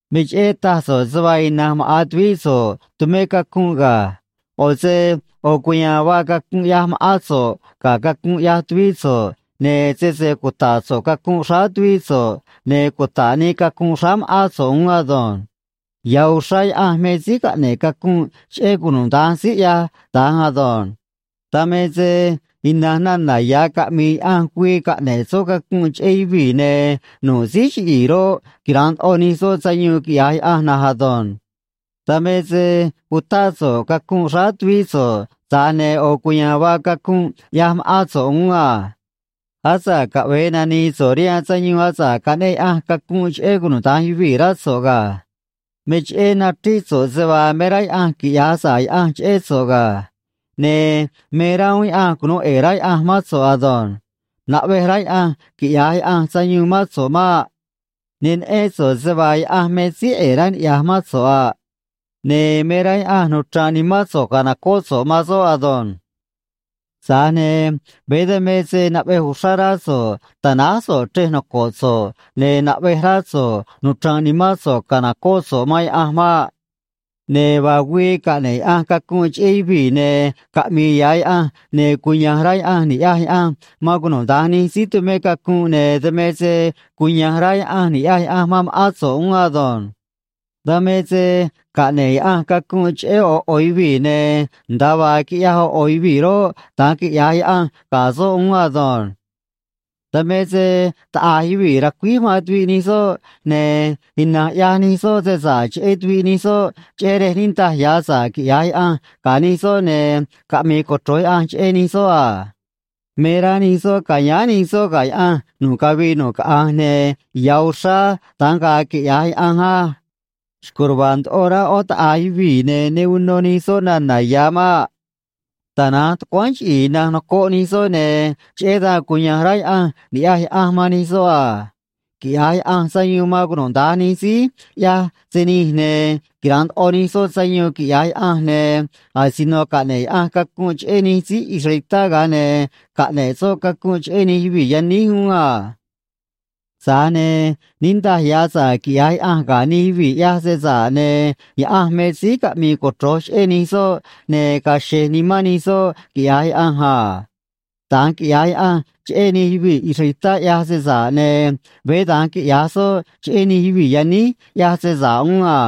Me cheꞌé taj so̱ꞌ se vaa ina̱nj maꞌa̱n tuvíꞌ so̱ꞌ tumé cacunꞌ ga̱. ꞌO̱ se ꞌo̱ cuya̱a̱n vaa cacunꞌ ꞌyaj ma̱ꞌán so̱ꞌ ga̱ cacunꞌ ꞌyaj tuvíꞌ so̱ꞌ, ne̱ sese cuta̱ꞌ so̱ꞌ cacunꞌ xráá tuvíꞌ so̱ꞌ, ne̱ cuta̱ꞌ nii cacunꞌ xráá ma̱ꞌán so̱ꞌ uún ado̱nj. Ya̱ uxrá Yaꞌanj me síí caꞌne̱ꞌ cacunꞌ cheꞌé cunuda̱nj síí ꞌyaj da̱nj ado̱nj. Dan me se ina̱nj nana̱ ya̱ caꞌmi̱i̱ Yaꞌanj güii caꞌne̱ꞌ soꞌ cacunꞌ cheꞌé yuvii̱, ne̱ nu̱ꞌ síí chiꞌi̱i̱ roꞌ, quira̱nꞌ ndoꞌo nij soꞌ sayuun, quiꞌya̱j Yaꞌanj na̱nj ado̱nj. Dan me se utáꞌ so̱ꞌ cacunꞌ xráá tuvíꞌ so̱ꞌ, tza̱j ne̱ ꞌo̱ cuya̱a̱n vaa cacunꞌ ꞌyaj ma̱ꞌán so̱ꞌ uún a. Asa̱ꞌ caꞌve̱e nani̱i̱ so̱ꞌ rihaan sayuun asa̱ꞌ caꞌneꞌ Yaꞌanj cacunꞌ cheꞌé cunuda̱nj yuvii̱, rá so̱ꞌ ga̱. Me cheꞌé nachríꞌ so̱ꞌ se vaa me rá Yaꞌanj quiꞌya̱j sa̱ꞌ Yaꞌanj cheꞌé so̱ꞌ ga̱. Ne̱ me rá uún Yaꞌanj cunu̱u ꞌe̱e̱ rá Yaꞌanj mán so̱ꞌ ado̱nj. Naꞌvej rá Yaꞌanj quiꞌya̱j Yaꞌanj sayuun mán so̱ꞌ maꞌ. Ne neꞌén so̱ꞌ se vaa Yaꞌanj me síí ꞌe̱e̱ rá niꞌya̱j mán so̱ꞌ a. Ne̱ me rá Yaꞌanj nuchra̱nꞌ nimán so̱ꞌ ca̱nocóꞌ so̱ꞌ man soꞌ ado̱nj. Tza̱j ne̱ veé dan me se naꞌvej uxrá rá so̱ꞌ ta̱náj so̱ꞌ chrej noco̱ꞌ so̱ꞌ, ne̱ naꞌvej rá so̱ꞌ nuchra̱nꞌ nimán so̱ꞌ ca̱nocóꞌ so̱ꞌ man Yaꞌanj maꞌ. Ne̱ vaa güii caꞌne̱ꞌ Yaꞌanj cacunꞌ cheꞌé yuvii̱, ne̱ caꞌmi̱i̱ ya̱ Yaꞌanj, ne̱ cuya̱nj rá Yaꞌanj ni̱ꞌyaj Yaꞌanj man cunuda̱nj nij síí tumé cacunꞌ, ne̱ dan me se cuya̱nj rá Yaꞌanj ni̱ꞌyaj Yaꞌanj man ma̱ꞌán so̱ꞌ uún ado̱nj. Dan me se caꞌne̱ꞌ Yaꞌanj cacunꞌ cheꞌé ꞌo̱ ꞌo̱ yuvii̱, ne̱ nda̱a vaa quiꞌyaj ꞌo̱ ꞌo̱ yuvii̱ roꞌ, da̱nj quiꞌya̱j Yaꞌanj ga̱ soꞌ uún ado̱nj. Dan me se taꞌa̱j yuvii̱ racuíj man tuviꞌ nij soꞌ, ne̱ ina̱nj ꞌyaj nij soꞌ se sa̱ꞌ cheꞌé tuviꞌ nij soꞌ, cheꞌé rej niꞌndaj ya̱ sa̱ꞌ quiꞌya̱j Yaꞌanj ga̱ nij soꞌ ne̱ caꞌmi̱i̱ cochro̱j Yaꞌanj cheꞌé nij soꞌ a. Me rá nij soꞌ ca̱yáán nij soꞌ ga̱ Yaꞌanj nu̱ꞌ cavii nu̱ꞌ caꞌanj, ne̱ ya̱ uxrá da̱nj ga̱a̱ quiꞌya̱j Yaꞌanj á. Xco̱j ruva̱a̱ ndoꞌo rá ꞌó taꞌa̱j yuvii̱, ne̱ ne uno nij soꞌ nana̱ ya̱ maꞌ. Tana̱nj tucuáán chiꞌi̱i̱ ina̱nj nocoꞌ nij soꞌ, ne̱ cheꞌé dan cuya̱nj rá Yaꞌanj ni̱ꞌyaj Yaꞌanj man nij soꞌ a. Quiꞌya̱j Yaꞌanj sayuun man cunuda̱nj nij síí ꞌyaj se nij, ne̱ quira̱nꞌ ndoꞌo nij soꞌ sayuun, quiꞌya̱j Yaꞌanj, ne̱ asino caꞌne̱ꞌ Yaꞌanj cacunꞌ cheꞌé nij síí israelitá, ga̱a ne̱ caꞌne̱ꞌ soꞌ cacunꞌ cheꞌé nij yuvii̱ yaníj uún a. Tza̱j ne̱ niꞌndaj ya̱ sa̱ꞌ quiꞌya̱j Yaꞌanj ga̱ nij yuvii̱ ꞌyaj se sa̱ꞌ, ne̱ Yaꞌanj me síí caꞌmi̱i̱ cochro̱j cheꞌé nij soꞌ, ne̱ ga̱a̱ xe̱j nimán nij soꞌ, quiꞌya̱j Yaꞌanj a. Da̱nj quiꞌya̱j Yaꞌanj cheꞌé nij yuvii̱ israelitá ꞌyaj se sa̱ꞌ, ne̱ veé da̱nj quiꞌya̱j soꞌ cheꞌé nij yuvii̱ yaníj ꞌyaj se sa̱ꞌ uún a.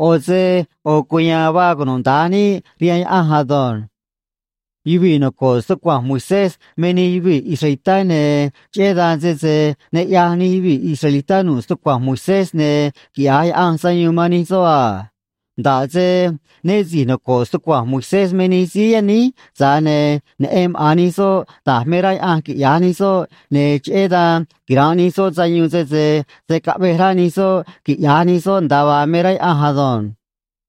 ꞌO̱ se ꞌo̱ cuya̱a̱n vaa cunuda̱nj níꞌ rihaan Yaꞌanj ado̱nj. Yuvii̱ noco̱ꞌ stucua̱nj Moisés me nij yuvii̱ israelitá, ne̱ cheꞌé dan, sese ne ꞌyaj nij yuvii̱ israelitá nu̱ꞌ stucua̱nj Moisés, ne̱ quiꞌya̱j Yaꞌanj sayuun man nij soꞌ a. Nda̱ꞌ se né si̱j nocoꞌ stucua̱nj Moisés me nij síí yaníj, tza̱j ne̱ neꞌen maꞌa̱n nij soꞌ da̱j me rá Yaꞌanj quiꞌya̱j nij soꞌ, ne̱ cheꞌé dan quira̱nꞌ nij soꞌ sayuun sese se̱ caꞌvej rá nij soꞌ quiꞌya̱j nij soꞌ nda̱a vaa me rá Yaꞌanj ado̱nj.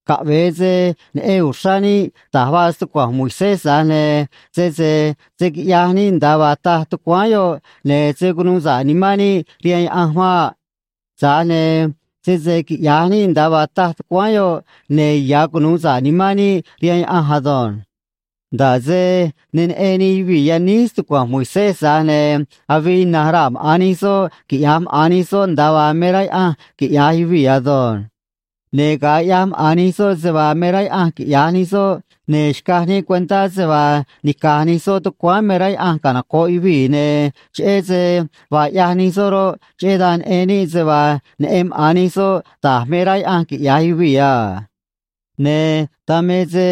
Caꞌve̱e se neꞌen uxrá níꞌ da̱j vaa stucua̱nj Moisés, tza̱j ne̱ sese se̱ quiꞌyaj níꞌ nda̱a vaa taj tucuáán yoꞌ, ne̱ se̱ cunuu sa̱ꞌ nimán níꞌ rihaan Yaꞌanj maꞌ. Tza̱j ne̱ sese quiꞌya̱j níꞌ nda̱a vaa taj tucuáán yoꞌ, ne̱ ya̱ cunu̱u sa̱ꞌ nimán níꞌ rihaan Yaꞌanj ado̱nj. Nda̱ꞌ se ne neꞌen nij yuvii̱ yaníj stucua̱nj Moisés, tza̱j ne̱ avii ina̱nj raa̱ maꞌa̱n nij soꞌ quiꞌya̱j maꞌa̱n nij soꞌ nda̱a vaa me rá Yaꞌanj quiꞌya̱j yuvii̱ ado̱nj. Ne̱ ga̱a ꞌyaj maꞌa̱n nij soꞌ se vaa me rá Yaꞌanj quiꞌya̱j nij soꞌ, ne̱ xcaj níꞌ cuentá se vaa nica̱j nij soꞌ tucuáán me rá Yaꞌanj canoco̱ꞌ yuvii̱, ne̱ cheꞌé se vaa ꞌyaj nij soꞌ roꞌ, cheꞌé dan neꞌen níꞌ se vaa neꞌen maꞌa̱n nij soꞌ da̱j me rá Yaꞌanj quiꞌya̱j yuvii̱ a. Ne̱ dan me se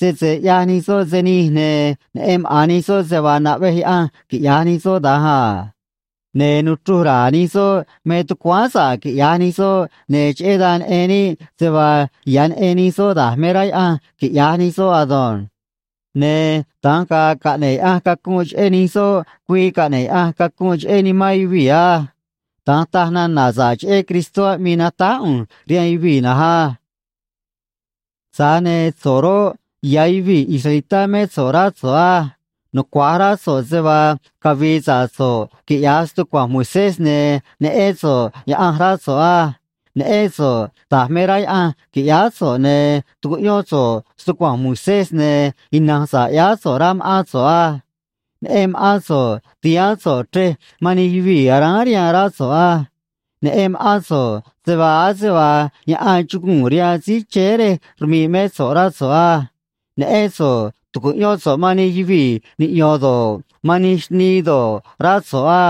sese ꞌyaj nij soꞌ se nij, ne̱ neꞌen maꞌa̱n nij soꞌ se vaa naꞌvej Yaꞌanj quiꞌya̱j nij soꞌ da̱nj a. Ne̱ nuchruj ra̱a̱ nij soꞌ me tucuáán sa̱ꞌ quiꞌya̱j nij soꞌ, ne̱ cheꞌé dan neꞌen níꞌ se vaa ya̱ neꞌen nij soꞌ da̱j me rá Yaꞌanj quiꞌya̱j nij soꞌ ado̱nj. Ne̱ da̱nj ga̱a̱ caꞌne̱ꞌ Yaꞌanj cacunꞌ cheꞌé nij soꞌ güii caꞌne̱ꞌ Yaꞌanj cacunꞌ cheꞌé nimán yuvii̱ á. Da̱nj taj nana̱ sa̱ꞌ cheꞌé Cristó aꞌmii natáj ꞌu̱nj rihaan yuvii̱ na̱nj á. Tza̱j ne̱ so̱ꞌ roꞌ, ya̱ yuvii̱ israelitá mé so̱ꞌ, rá so̱ꞌ á. Nucua̱j rá so̱ꞌ se vaa cavi̱i̱ sa̱ꞌ so̱ꞌ, quiꞌya̱j stucua̱nj Moisés, ne̱ neꞌén so̱ꞌ Yaꞌanj, rá so̱ꞌ á. Neꞌén so̱ꞌ da̱j me rá Yaꞌanj qui̱ꞌyáá so̱ꞌ, ne̱ tucuꞌyón so̱ꞌ stucua̱nj Moisés, ne̱ ina̱nj sa̱ꞌ ꞌyáá so̱ꞌ, rá ma̱ꞌán so̱ꞌ á. Neꞌen ma̱ꞌán so̱ꞌ ti̱haán so̱ꞌ chrej man nij yuvii̱ aráán rihaan, rá so̱ꞌ á. Neꞌen ma̱ꞌán so̱ꞌ se vaa ase vaa yaꞌan chuguu̱n rihaan síí chéé rej rmi̱ꞌ mé so̱ꞌ, rá so̱ꞌ á. Neꞌén so̱ꞌ tu̱cuꞌyón so̱ꞌ man nij yuvii̱ niꞌyo̱n do̱ꞌ, man nij xnii do̱ꞌ, rá so̱ꞌ á.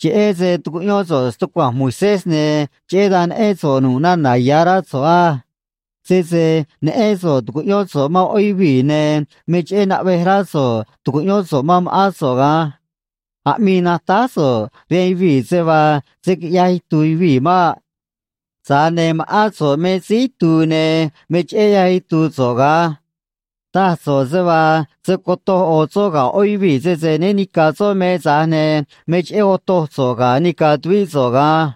Cheꞌé se tucuꞌyón so̱ꞌ stucua̱nj Moisés, ne̱ cheꞌé dan neꞌén so̱ꞌ nu̱ꞌ nana̱ ya̱, rá so̱ꞌ á. Sese neꞌén so̱ꞌ tu̱cuꞌyón so̱ꞌ man ꞌó yuvii̱, ne̱ me cheꞌé naꞌvej rá so̱ꞌ tu̱cuꞌyón so̱ꞌ man ma̱ꞌán so̱ꞌ ga̱an. Aꞌmii natáj so̱ꞌ rihaan yuvii̱ se vaa se̱ quiꞌyaj itu̱u̱ yuvii̱ maꞌ. Tza̱j ne̱ ma̱ꞌán so̱ꞌ me síí itu̱u̱, ne̱ me cheꞌé ꞌyaj itu̱u̱ so̱ꞌ ga̱an. Taj so̱ꞌ se vaa se̱ cotoj ꞌo̱ soꞌ ga̱ ꞌó yuvii̱ sese né ni̱ca̱ soꞌ me, tza̱j ne̱ me cheꞌé otoj so̱ꞌ ga̱ nica̱ tuvíꞌ so̱ꞌ ga̱an.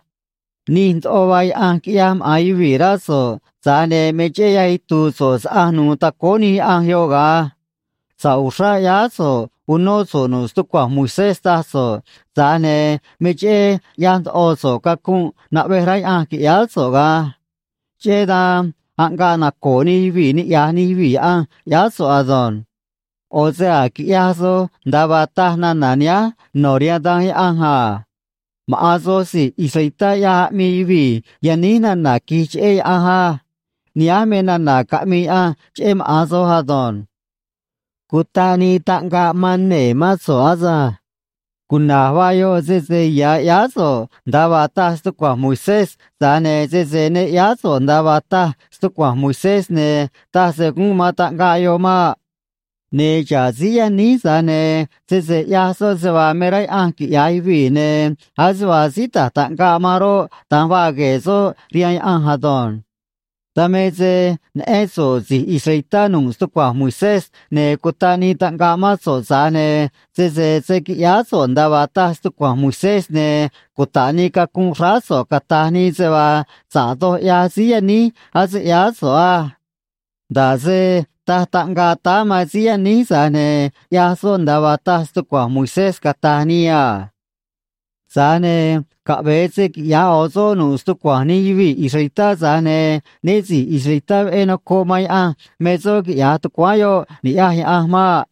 Nij ndoꞌo vaa yaꞌanj quiꞌyaj maꞌa̱n yuvii̱, rá so̱ꞌ, tza̱j ne̱ me cheꞌé ꞌyaj itu̱u̱ so̱ꞌ saꞌanj nu̱u̱ tacóó nij yaꞌanj yoꞌ ga̱an. Sa̱ꞌ uxrá ꞌyáá so̱ꞌ unó so̱ꞌ nu̱ꞌ stucua̱nj Moisés, taj so̱ꞌ, tza̱j ne̱ me cheꞌé ꞌyaj ndoꞌo so̱ꞌ cacunꞌ naꞌvej rá Yaꞌanj qui̱ꞌyáá so̱ꞌ ga̱an. Cheꞌé dan aꞌngaꞌ naco̱o̱ nij yuvii̱ niꞌya̱j nij yuvii̱ Yaꞌanj, ꞌyáá so̱ꞌ ado̱nj. ꞌO̱ se a̱j quiꞌyaj soj nda̱a vaa taj nana̱ nihánj no̱ rihaan Danj Yaꞌanj a: “Maꞌa̱n soj si̱j israelitá ꞌyaj aꞌmii yuvii̱ yaníj nana̱ qui̱j cheꞌé Yaꞌanj á.” Nihánj me nana̱ caꞌmii Yaꞌanj cheꞌé maꞌa̱n soj ado̱nj. Cutaꞌ nii taꞌngaꞌ man nee̱ mán so̱ꞌ asânj. Cuna̱j vaa yoꞌ, sese ya̱ ꞌyáá so̱ꞌ nda̱a vaa taj stucua̱nj Moisés, tza̱j ne̱ sese ne ꞌyáá so̱ꞌ nda̱a vaa taj stucua̱nj Moisés, ne̱ taj se gúnꞌ man taꞌngaꞌ yoꞌ maꞌ. Ne̱ xa̱ꞌ síí yaníj, tza̱j ne̱ sese ꞌyaj soꞌ se vaa me rá Yaꞌanj quiꞌya̱j yuvii̱, ne̱ ase vaa síí ta̱j taꞌngaꞌ man roꞌ, da̱nj vaa gue̱e̱ soꞌ rihaan Yaꞌanj ado̱nj. Dan me se neꞌén so̱ꞌ si̱j israelitá nu̱ꞌ stucua̱nj Moisés, ne̱ cutaꞌ nii taꞌngaꞌ mán so̱ꞌ, tza̱j ne̱ sese se̱ quiꞌyáá so̱ꞌ nda̱a vaa taj stucua̱nj Moisés, ne̱ cuta̱ꞌ nii cacunꞌ xráá so̱ꞌ, cata̱j nii se vaa sa̱ꞌ doj ꞌyaj síí yaníj ase ꞌyáá so̱ꞌ á. Nda̱ꞌ se taj taꞌngaꞌ táá man síí yaníj, tza̱j ne̱ ꞌyaj soꞌ nda̱a vaa taj stucua̱nj Moisés, cata̱j nii a. Tza̱j ne̱ caꞌve̱e se quiꞌya̱j ꞌo̱ soꞌ nu̱ꞌ stucua̱nj nij yuvii̱ israelitá, tza̱j ne̱ né si̱j israelitá veꞌé nocoꞌ man Yaꞌanj me soꞌ, quiꞌya̱j tucuáán yoꞌ, ni̱ꞌyaj Yaꞌanj maꞌ.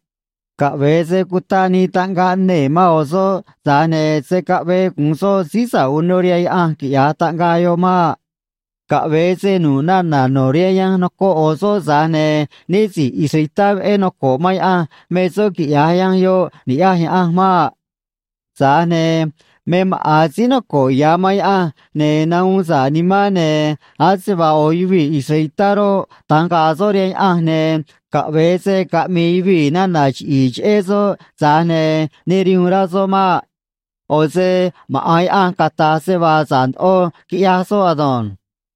Caꞌve̱e se cutaꞌ nii taꞌngaꞌ nee̱ man ꞌo̱ soꞌ, tza̱j ne̱ se̱ caꞌvee gu̱un soꞌ síí sa̱ꞌ uno rihaan Yaꞌanj, quiꞌya̱j taꞌngaꞌ yoꞌ maꞌ. Caꞌve̱e se nu̱ꞌ nana̱ no̱ rihaan yanj nocoꞌ ꞌo̱ soꞌ, tza̱j ne̱ né si̱j israelitá veꞌé noco̱ꞌ man Yaꞌanj me soꞌ, quiꞌya̱j yanj yoꞌ, ni̱ꞌyaj Yaꞌanj maꞌ. Tza̱j ne̱ me maꞌa̱n síí noco̱ꞌ ya̱ man Yaꞌanj ne̱ nahuun sa̱ꞌ nimán, ne̱ ase vaa ꞌo̱ yuvii̱ israelitá roꞌ, da̱nj ga̱a̱ soꞌ rihaan Yaꞌanj, ne̱ caꞌve̱e se caꞌmi̱i̱ yuvii̱ nana̱ chiꞌi̱i̱ cheꞌé soꞌ, tza̱j ne̱ ne rihuun rá soꞌ maꞌ. ꞌO̱ se maꞌa̱n Yaꞌanj cata̱j se vaa sa̱ꞌ ndoꞌo quiꞌyaj soꞌ ado̱nj.